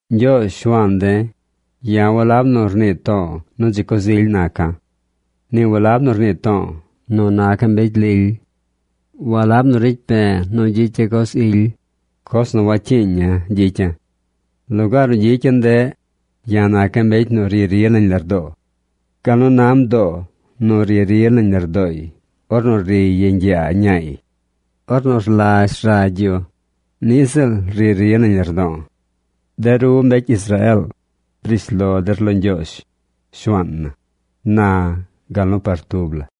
Ñgyoozh, Shuaan de̱, ya̱ walab nu rnii to̱o̱ nu dzi coz ily naca̱. Ni walab nu rnii to̱o̱ nu naca̱ mbecy lily. Walab nu ricy pe̱e̱ nu gyicya̱ coz ily, coz nu wacyiiña̱ gyicya̱. Lugaar nu gyicya̱ ndeꞌ, ya̱ naca̱ mbecy nu ri ri nañ lardoo. Gal nu na mdoo nu ri ri nañ lardooy ornu riy yeñ yaa ñaay ornu rlazh ragy yu, niꞌ ziꞌl ri ri nañ lardo̱o̱. De ru mbecy Israeel, briish lo der lo Ñgyoozh, Shuaan na, na gal nu par tub la.